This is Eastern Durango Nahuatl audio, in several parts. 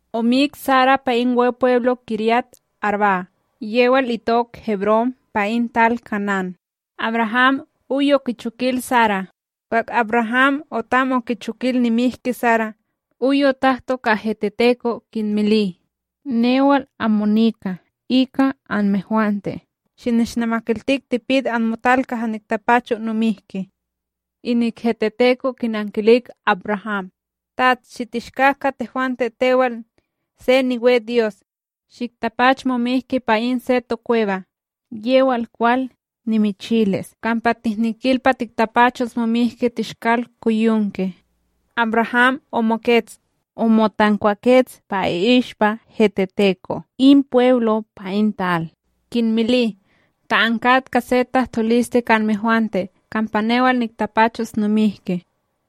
omik Sara pa in Wepweblo Kiryat-arbá, yewal itok Hebrón, pa in tal Kanán. AbRaham oy okichokil Sara. Kwah AbRaham otam okichokil nimihki Sara oy otahto ka heteteto' kinmili: ―Newal amo nika ika anmehwante; shinishnamakiltik tipit anmotal kaha niktapacho nomihki. Inik heteteko' kinankilik AbRaham: ―Tats, shitishkak; ka tehwante tewal se niwe Dyos, shiktapach momihki pa in se tokweba yewal kwal, nimichilis kampa tihnikil pa tiktapachos momihki Teshkalkoyonke. AbRaham omokets, omotankwakets pa i'ishpa heteteko' in pweblo pa in tal, kinmili: ―Ta ankat ka se tahtoliste ka anmehwante kampa newal niktapachos nomihki,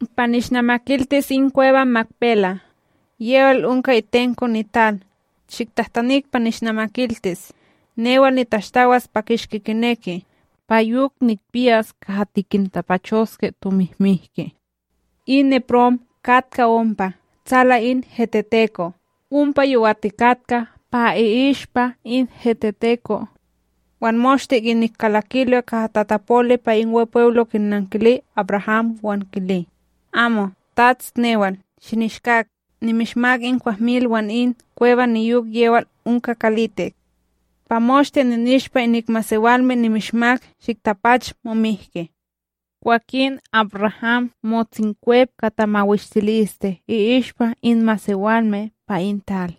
pa nishnamakiltis in kweba Makpela, yewal onka itenko nital. Shiktahtanik pa nishnamakiltis newal nitashtawas pa kishki kineki, pa yok nikpiyas kaha tikintapachoske tomihmiki. In Eprón katka ompa, tsala in heteteko', ompa yowatikatka pa i'ishpa in heteteko wan moshte inik kalakilo kaha tatapoli pa in Wepweblo kinankili AbRaham wan kili: ―Amo, Tats newal, shinishkak. Nimishmak in kwahmil wan in kweba niyok yewal onka kalitik. Pa moshte ninishpa, inik masewalme nimishmak. Shiktapach momihki. Kwakin AbRaham motsinkwep ka tamawishtiliste i'ishpa in masewalme pa in tal,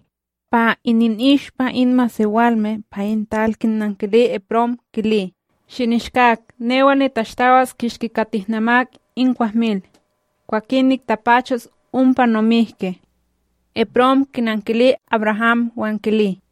pa ininishpa in masewalme pa in tal kinankili Eprón, kili: ―Shinishkak, newal nitashtawas kishki ka tihnamak in kwahmil. Kwakin niktapachos ompa nomihki. Eprón kinankili AbRaham wan kili: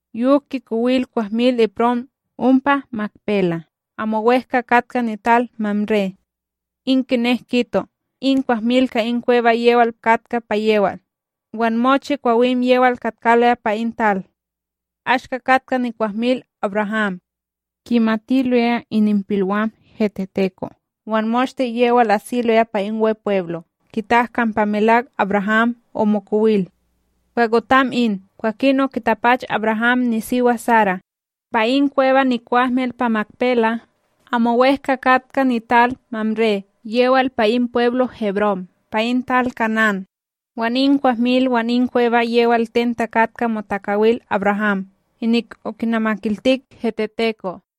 Yok kikowil kwahmil Eprón ompa Makpela, amo wEhka katka nital Mamré, in kinek kito, in kwahmil ka in kweba yewal katka pa yewal wan mochi kwawim yewal katkaloya pa in tal. Ashka katka nikwahmil AbRaham, kimatiloya ininpilwam heteteko' wan moshte yewal asiloya pa in Wepweblo kitak kampa melak AbRaham omokowil. Kwah otam in, kwakin okitapach AbRaham nisiwa, Sara, pa in kweba nikwahmil pa Makpela amo wEhka katka nital Mamré, yewal pa in pweblo Hebrón, pa in tal Kanán. Wan in kwahmil wan in kweba yewal ten takatka motakawil AbRaham, inik okinamakiltik heteteko'.